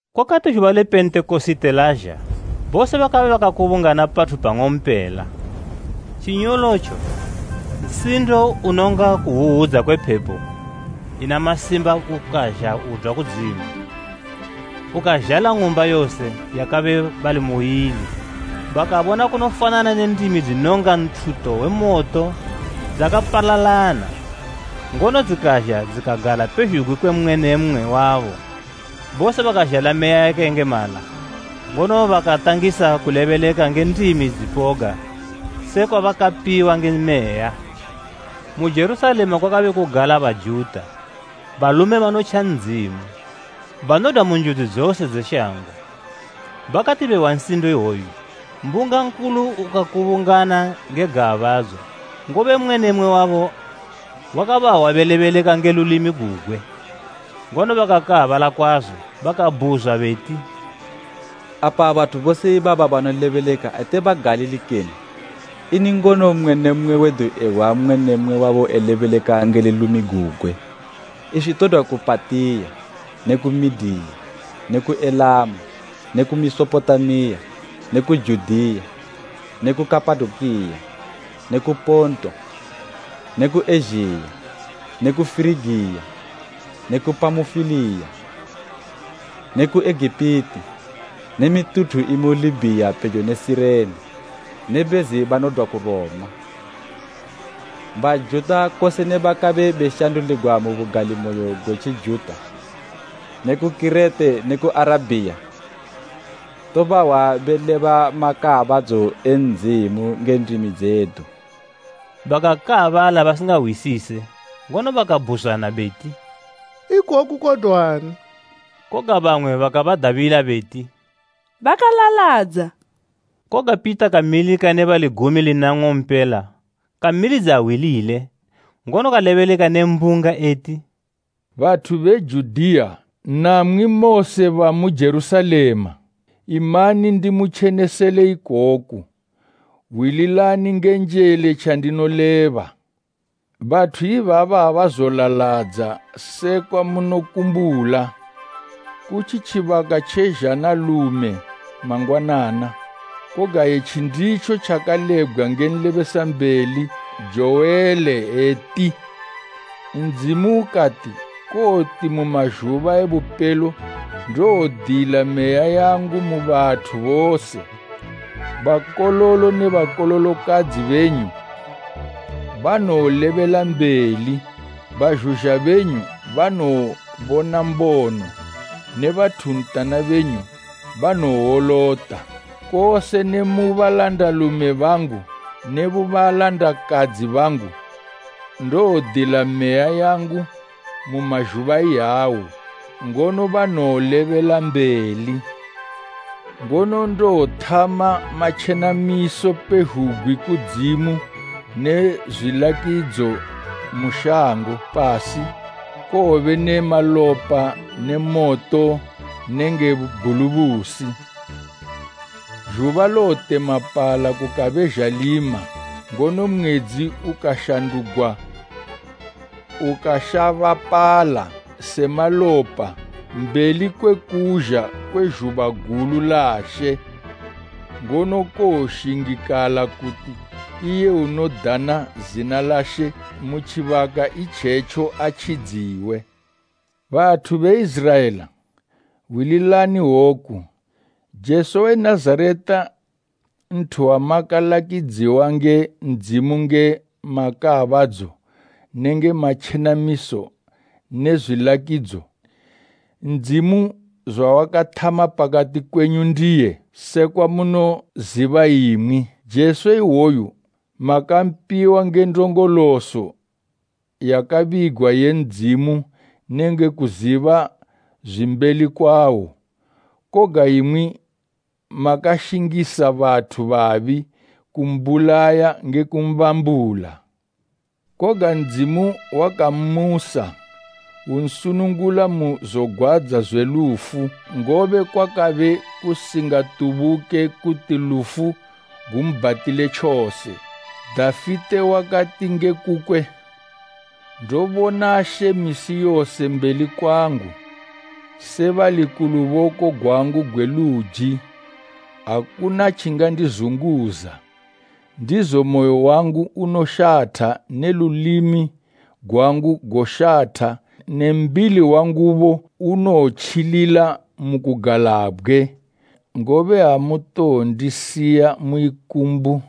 Kwakati zhuba le Pentekosite lazha, bose bakabe bakakubungana pathu pang'ompela. Tjinyolotjo, nsindo unonga kuhwuhwudza kwe phepo ina masimba ukazha udwa kudzimu, ukazhala ng'umba yose yabakabe bali muili. Bakabona kunofanana ne ndimi dzinonga nthuto we moto dzakapalalana, ngono dzikazha dzikagala pezhugwi kwe mmwe ne mmwe wabo. Bose bakazhala Meya yakayengemala, ngono bakatangisa kulebeleka nge ndimi dzipoga sekwa bakapiwa nge Meya. Mu Jerusalema kwakabe kugala Bajuta, balume banotja Ndzimu, banodwa mu njudzi dzose dze shango. Bakati behwa nsindo iwoyu, mbunga nkulu ukakubungana nge gaabadzo, ngobe mmwe ne mmwe wabo wakabahwa belebeleka nge lulimi gugwe. Ngono bakakaabala kwazo, bakabhuzwa beti, “Apa bathu bose ibaba banolebeleka ate Bagalili kene? Ini ngono mmwe ne mmwe wedu ehwa mmwe ne mmwe wabo elebeleka nge lulimi gugwe? Iswi todwa ku Patiya ne ku Mediya ne ku Elamu ne ku Mesopotamiya ne ku Judiya ne ku Kapadokiya ne ku Ponto ne ku Ezhiya ne ku Firigiya ne ku Pamufiliya ne ku Egipiti ne mituthu imu Libhiya pejo ne Sirene, ne bezi banodwa ku Roma, Bajuta kose ne bakabe beshanduligwa mu bugalimoyo gwe Tjijuta ne ku Kirete ne ku Arabhiya tobahwa beleba makaabadzo e Ndzimu nge ndimi dzedu!” Bakakaabala basingahwisise, ngono bakabhuzwana beti, “Ikoku kodwani?” Koga bamwe bakabadadila beti, “Bakalaladza.” Koga Pita kamilika ne bali gumi lina nng'ompela, kamilidza hwi lile, ngono kalebeleka ne mbunga eti, “Bathu be Judiya, namwi mose bamu Jerusalema, imani ndimutjenesele ikoku; hwililani nge njele tjandinoleba. Bathu ibaba abazolaladza sekwa munokumbula. Kutji tjibaka tje zhanalume mangwanana. Koga etji nditjo tjakalebgwa nge nlebesambeli Jowele eti, “ ‘Ndzimu ukati: Kowoti mu mazhuba e bupelo ndowodila Meya yangu mu bathu bose. Bakololo ne bakololokadzi benyu banowolebela mbeli bazhuzha benyu banowobona mbono ne bathuntana benyu banowowolota. Kose ne mu balandalume bangu ne mu balandakadzi bangu ndowodila Meya yangu mu mazhuba iyawo, ngono banowolebela mbeli. Ngono ndowothama matjenamiso pezhugwi kudzimu ne zwilakidzo mu shango, pasi, kowobe ne malopa ne moto nenge bhulubusi. Zhuba lowotemapala kukabe zhalima ngono mwedzi ukashandugwa ukashabapala se malopa mbeli kwe kuzha kwe zhuba gulu la She. Ngono kowoshingikala kuti iye unodana zina la She mu tjibaka itjetjo atjidziwe.’ “Bathu be Iziraela, hwililani woku, Jesu we Nazareta nthu wamakalakidziwa nge Ndzimu nge matjenamiso makaabadzo nenge matjenamiso ne zwilakidzo, Ndzimu zwawakathama pakati kwenyu ndiye, sekwa munoziba imwi. Jesu iwoyu makampiwa nge ndongoloso yakabigwa ye Ndzimu nenge kuziba zwimbeli kwawo; koga imwi makashingisa bathu babi kumbulaya nge kumbambula. Koga Ndzimu wakammusa; unsunungula mu zogwadza zwe lufu, ngobe kwakabe kusingatubuke kuti lufu gumbhatile tjose. Dafite wakati nge kukwe, “ ‘Ndobona She misi yose mbeli kwangu. Se bali ku luboko gwangu gwe luji, akuna tjingandizunguza. Ndizo moyo wangu unoshatha ne lulimi gwangu goshatha ne mbili wangubo unowotjilila mu kugalabgwe, ngobe amutowondisiya mu ikumbu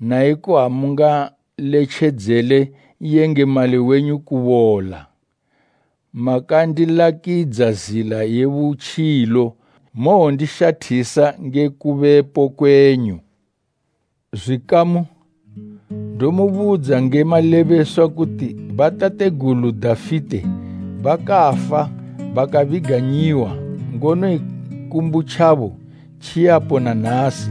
naiko amungaletjedzele N'yengemali wenyu kubola. Makandilakidza zila ye butjilo, mowondishathisa nge kubepo kwenyu!’ “Zwikamu, ndomubudza nge malebeswa kuti batategulu Dafite bakafa bakabiganyiwa, ngono ikumbu tjabo tjiyapo na nasi.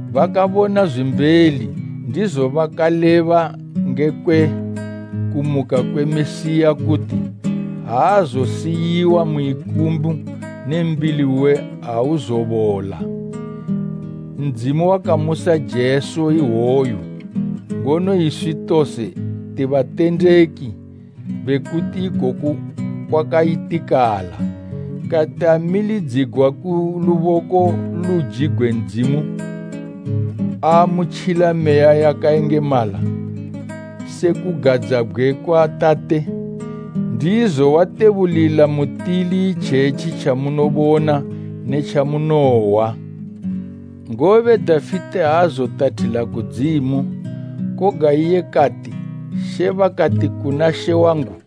Bakabona zwimbeli ndizo bakaleba ngekwe kumuka kwe Mesiya kuti, ‘Aazosiyiwa mu ikumbu ne mbili uwe auzobola.’ Ndzimu wakamusa Jesu ihwoyu, ngono iswi tose ti batendeki bekuti ikoku kwakayitikala. Kati amilidzigwa ku luboko gwe luji gwe Ndzimu, aamutjila Meya yakayengemala se kugadzabgwe kwa Tate, ndizo watebulila mutili itjetji tjamunobona ne tjamunohwa. Ngobe Dafite aazotathila kudzimu, koga iye kati, “ ‘She bakati kuna She wangu: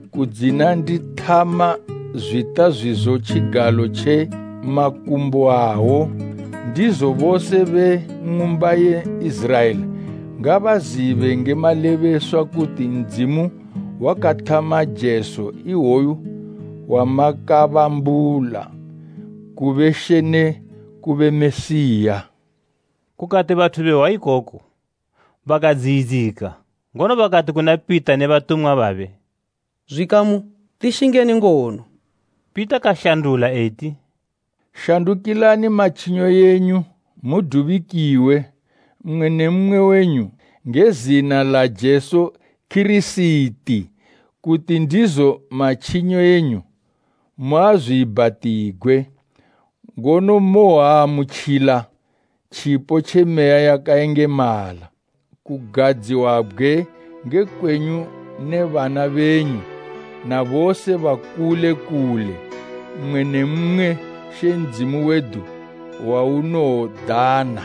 kudzina ndithama zwita zwizo tjigalo tje makumbo awo.’ “Ndizo bose be ng'umba ye Iziraela ngabazibe nge malebeswa kuti Ndzimu wakathama Jesu iwoyu wamakabambula kube She ne kube Mesiya!” Kukati bathu behwa ikoku, bakadziyidzika, ngono bakati kuna Pita ne batumwa bamwe, “Zwikamu, tishingeni ngono?” Pita kashandula eti, “Shandukilani matjinyo enyu mudubikiwe, mmwe ne mmwe wenyu nge zina la Jesu Kirisiti kuti ndizo matjinyo enyu muazwiibhatigwe. Ngono mowoamutjila tjipo tje Meya yakayengemala. Kugadziwabgwe nge kwenyu ne bana benyu na bose bakule kule, mmwe ne mmwe She Ndzimu wedu waunowodana.”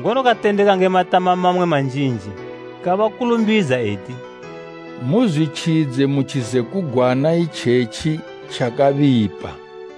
Ngono katendeka nge matama mamwe manjinji kabakulumbidza eti, “Muzwitjidze mu tjizekugwana itjetji tjakabipa.”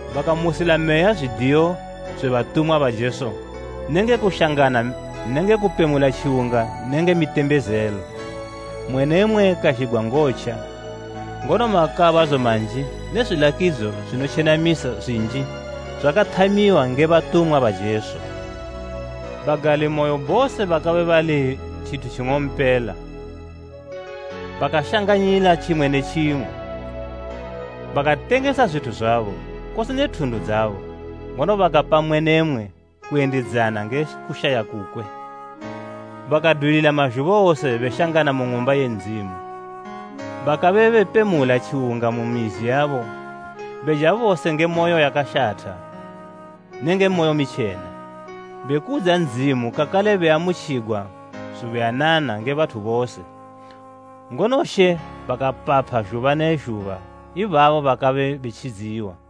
Bakamusila meya zwidiyo zwe batumwa ba Jesu nenge kushangana nenge kupemula tjiwunga nenge mitembezelo. Mmwe ne mmwe kazhigwa ngotja, ngono makaabadzo manji ne zwilakidzo zwinotjenamisa zwinji zwakathamiwa nge batumwa ba Jesu. Bagalimoyo bose bakabe bali tjithu tjing'ompela, bakashanganyila tjimwe ne tjimwe. Bakatengesa zwithu zwabo, kose ne thundu dzabo, ngono bakapa mmwe ne mmwe kuyendidzana nge kushaya kukwe. Bakadwilila mazhuba wose beshangana mu Ng'umba ye Ndzimu. Bakabe bepemula tjiwunga mu mizi yabo beja bose nge moyo yakashatha nenge moyo mitjena, bekudza Ndzimu kakale beamutjigwa zubuyanana nge bathu bose. Ngono She bakapapha zhuba ne zhuba ibabo bakabe betjidziwa.